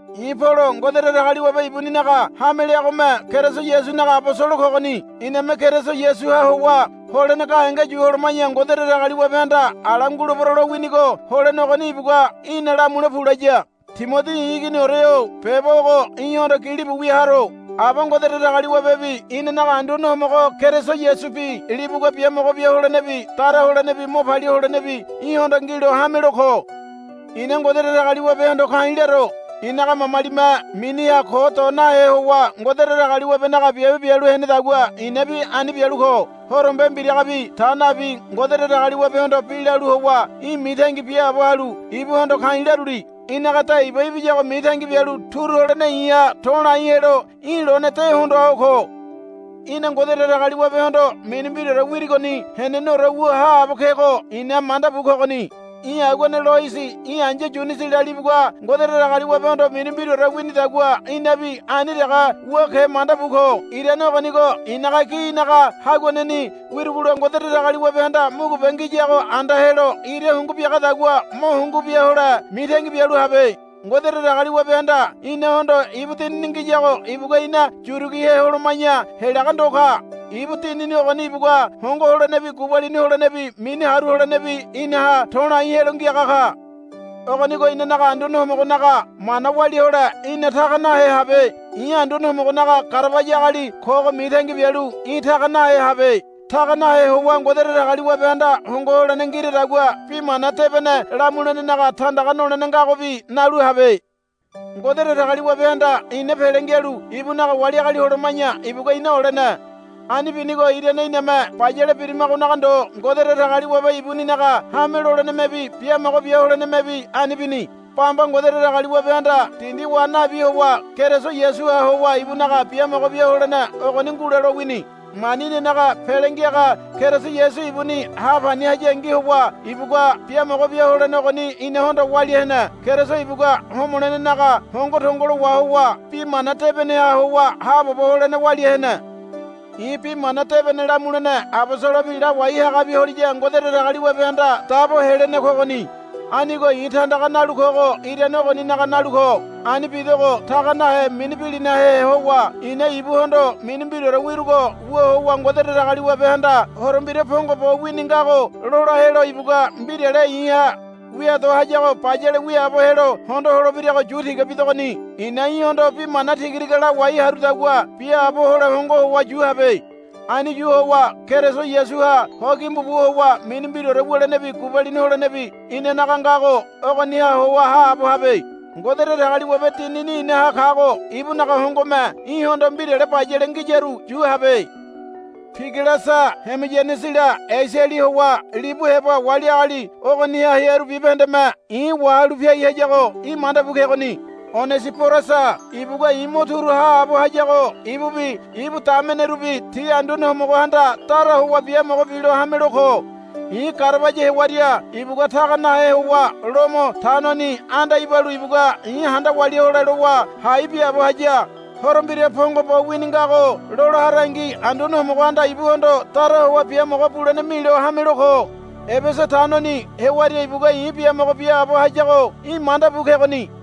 I̱ Polo Ngode Datagaliwabe ibuninaga hame leagome Keriso Yasunaga abosolo kogoni. Iname Keriso Yasuha howa holene gahenge yu holoma̱ya Ngode Datagaliwabehanda ala ngulebero lowinigo holene ogoni ibugua, Í̠na lamule pu, laya. Timodi i̱ iginiore-o beba ogo í̠hondo gilibu wia haro. Aba Ngode Datagaliwabebi inanaga Anduane Homogo Keriso Yasubi libugua biamogo bia holenebi dara holenebi mo palia holenebi í̠hondo ngilo hamelo ko. I̱na Ngode Datagaliwabehondo ka̱i̱ laro. I̱naga mamalime miniha ko do nahe howa Ngode Datagaliwabenaga biabe bialu henedagua i̱nabi ani bialu ko. Horombe mbiragabi ta nabi Ngode Datagaliwabehondo bi lalu howa í̠ mitangi biaabo halu ibuhondo ka̱i̱ laruli. Í̠naga de iba ibiyago mitangi bialu turu holene i̱ha to̱lai helo í̠ lone de hondoa ho ko. Í̠na Ngode Datagaliwabehondo mini mbiraore wirigoni heneneore wu haabo kego i̱na manda bu kogoni. Í̠ aguane Loisi í̠ ai̱ya Yunisila libugua Ngode Datagaliwabehondo mini mbiraore winidagua í̠nabi ani dege wu ke manda bu ko. Irane ogonigo i̱naga gi í̠naga haguaneni wirugola Ngode Datagaliwabehanda mugube ngiyago anda helo ira hungu biagadagua mo hungu biahole mitangi bialu habe. Ngode Datagaliwabehanda inahondo ibu Dinini ngiyago ibugua ina yurigihe holoma̱ya helaga ndo ka. Ibu Dinini ogoni ibugua hongo holenebi gubalini holenebi mini haru holenebi inaha to̱lai helo ngiaga ka. Ogonigo inanaga Anduane Homogonaga mana walia hole í̠na taga nahe habe. I̱ Anduane Homogonaga garabaya agali kogo mitangi bialu í̠ taga nahe habe. Taga nahe howa Ngode Datagaliwabehanda hongo holene ngiradagua Bi Mana Debene lamulenenaga tandaga nolene ngagobi nalu habe. Ngode Datagaliwabehanda ina pele ngialu ibunaga wali agali holoma̱ya ibugua ina olene. Ani binigo irane iname bayale birimagonaga ndo Ngode Datagaliwabe ibuninaga hame lolenemebi biamogo bia holenemebi ani bini. Bamba Ngode Datagaliwabehanda dindi wa nabi howa Keriso Yasuha howa ibunaga biamogo bia holene ogoni ngule lowini. Mani inanaga Pele Ngiaga Keriso Yasu ibuni hapani hayangi howa ibugua biamogo bia holene ogoni inahondo walia hene. Keriso ibugua homolenenaga hongo tongolo wahowa bi mana debeneha howa haabobo holene walia hene. I̱ Bi Mana Debene lamulene abosolobi lawai hagabi holiya Ngode Datagaliwabehanda dabo helene kogoni. Anigo i̱ tandaga nalu kogo irane ogoninaga nalu ko. Ani bidogo taga nahe mini bilinahe howa i̱na ibuhondo mini mbiraore wirugo wu howa Ngode Datagaliwabehanda Horo Mbira pongo bo wini ngago lola helo ibugua mbirale i̱ha wia do hayago bayale wiaabo helo hondo holebirago yu tiga bidogoni. I̱na í̠hondo bi mana tigatiga lawai harudagua biaabo hole hongo howa yu habe. Ani yu howa Keriso Yasuha ho gimbu bu howa mini mbiraore wulenebi gubalini holenebi inanaga ngago ogoniha howa haabo habe. Ngode Datagaliwabe Dinini inaha kago ibunaga hongome í̠hondo mbirale bayale ngiyaru yu habe. Pigelasa Hemoyanesila Esiali howa libu heba wali agali ogoniha hearu bibahendeme i̱ wahalu piai hayago í̠ manda bu kegoni. Onesiborasa ibugua i̱ mo turu haabo hayago ibubi ibu damenerubi ti Anduane Homogohanda dara howa biamogo bilo hamelo ko. I̱ garabaya hewaria ibugua taga nahe howa Lomo tanoni anda ibalu ibugua i̱ handa walia hole lowa hai biaabo haya. Horo Mbira pongo bo wini ngago lola harangi Anduane Homogohanda ibuhondo dara howa biamogo bulene milo hamelo ko. Ebesa tanoni hewaria ibugua i̱ biamogo biaabo hayago í̠ manda bu kegoni.